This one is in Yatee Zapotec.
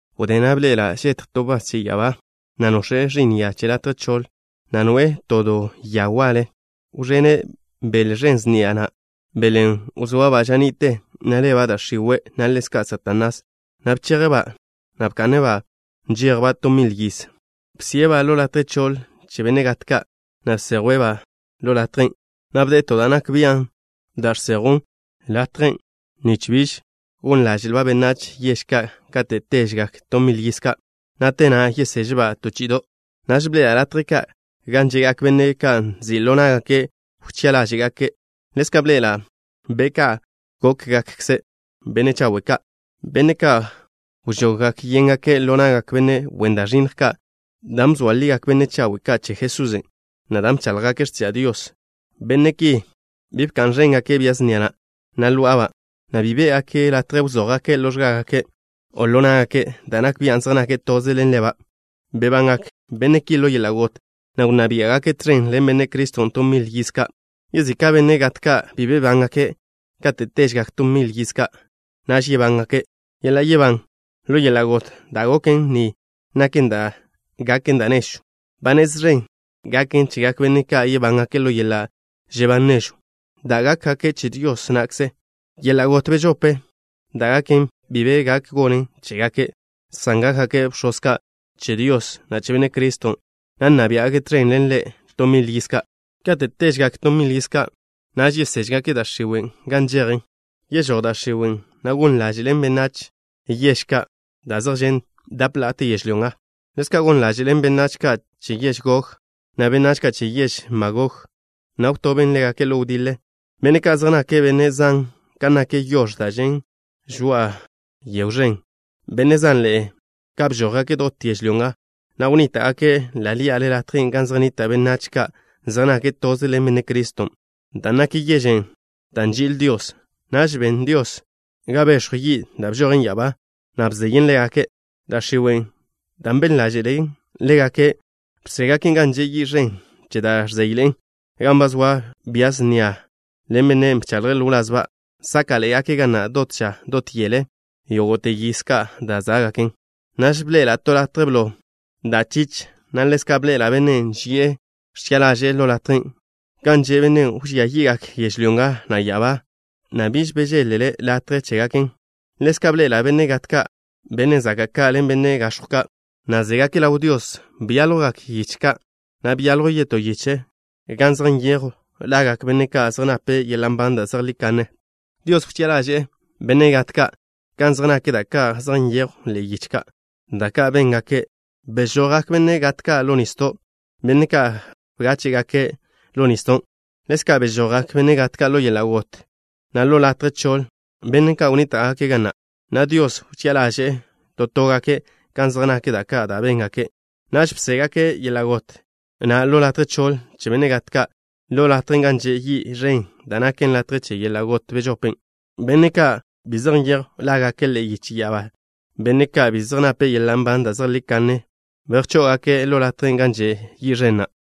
Wdé na' bḻe'ela' žetj to wbás che ya'abá, na' nox̱e' ẕi'n ya che latje choḻ, na' noe'e to do ya waḻe. Wẕene' bele ẕen sniaḻe'e na', belen' wzoaba' ža ni'te, na' leba' da' x̱iwe', na' ḻezka' Satanás, na' bcheje'-ba', na' bka'ne'-ba' nžejba' to mil yiz. Wžo'ne'-ba' latje choḻ che benne' gat ka', na' bsejwe' latjen', na' bde'e to da' nak bian' da' žsejwn latjen' nich biž gon ḻáže'lba' benách yež ka' kate' téžegak to mil yiz ka', na' te na' yeyežba' to chi'ido'. Naž bḻe'ela' latje ka' gan že'gak benne' ka' nzi' ḻo ná'gake' wchi'a ḻáže'gake'. Ḻezka' bḻe'ela' be' ka' gókgakkze benne' chawe' ka', benne' ka' wžoggak yéngake' ḻo na'gak benne' wen da' ẕinnj ka' dan' bzoa ligak benne' chawe' ka' che Jesusen', na' dan' bcháḻjgake' x̱tiža' Dios. Benne' ki bi bka'n ẕéngake' bia snia na', na' ló'aba', na' bi bé'gake' latje wzój ḻo x̱gágake', o ḻo ná'gake' da' nak bian' zej nake' toze ḻen leba'. Bebangak benne' ki ḻo yeḻa' got, na' wnná biá'gake' tẕen ḻen Benne' Criston' to mil yiz ka'. Yezika' benne' gat ka' bi bebángake'. Kate' téžegak to mil yiz ka', naž yebángake'. Yeḻa' yebán ḻo yeḻa' got da' goken ni naken da' gaken da' nežw. Ba nez ẕen gaken chegak benne' ka' yebángake' ḻo yeḻa' žebán nežw da' gaken, dan' gákgake' che Dios na'kze. Yeḻa' got bežope da' gaken bi be gak gonen chégake', san gákgake' bx̱oz ka' che Dios, na' che Benne' Criston', na' nna biá'gake' tẕen ḻen Ḻe' to mil yiz ka'. Kate' téžegak to mil yiz ka', naž yeséžgake' da' x̱iwe' gan nžejen. Yežój da' x̱iwe', na' gon ḻáže'len benách yež ka' da' zej žen' dap la'ate yežlyó nga. Ḻezka' gon ḻáže'len benách ka' che yež Gog, na' benách ka' che yež Magog, na' wtoben ḻégake' ḻo wdiḻe. Benne' ka' zej nake' benne' zan kan nak yox̱ da' žen' žoa'a to yegw ẕen. Benne' zanḻe'e ka' bžójgake' dot yežlyó nga, na' wnníta'gake' ḻa' ḻí'ale latjen' gan zej nnita' benách ka' zej nake' toze ḻen Benne' Criston', da' naken yežen' da' nži'il Dios. Naž ben Dios ga bex̱jw yi' da' bžojen ya'abá, na' bzeyen ḻégake'. Da' x̱iwe', dan' ben ḻáže'len ḻégake', wžó'ngaken' gan že' yi' ẕen che da' ẕzéyḻe'en, gan ba zoa bia snia na' ḻen bennen' bchaḻje' ḻo wlazba'. Sáka'ḻe'egake' ga na' dot ža dot yele yógo'te yiz ka' da' zá'gaken. Naž bḻe'ela' to latje blo da' chich, na' ḻezka' bḻe'ela' Bennen' ži'e ẕchi'a ḻaže'e ḻo latjen'. Gan že' Bennen' wẕía yi'gak yežlyó nga, na' ya'abá, na' biž bežéḻ-le latje chégaken. Ḻezka' bḻe'ela' benne' gat ka', benne' zaka' ka' ḻen benne' gax̱jw ka', na' zégake' ḻaw Dios. Byáljwgak yiche ka', na' byaljw yetó yiche gan zej nyejw lagak benne' ka' zej nape' yeḻa' nban da' zejlí kanne. Dios wchi'a ḻaže'e benne' gat ka' kan zej nak da' ka' zej nyejwn ḻe'e yiche ka', da' ka' béngake'. Bežojgak benne' gat ka' ḻo nisdo', benne' ka' bgáche'gake' ḻo nisdon'. Ḻezka' bežojgak benne' gat ka' ḻo yeḻa' got, na' ḻo latje choḻ, benne' ka' wnníta'gake' ga na', na' Dios wchi'a ḻaže'e to tógake' kan zej nak da' ka' da' béngake'. Naž bžó'ngake' yeḻa' got, na' latje choḻ che benne' gat ka', ḻo latjen' gan že' yi' ẕen da' naken latje che yeḻa' got bežopen'. Benne' ka' bi zej nyejw lágake' ḻe'e yiche ya'abá, benne' ka' bi zej nape' yeḻa' nban da' zejlí kanne, bejcházgake' latjen' gan že' yi' ẕen na'.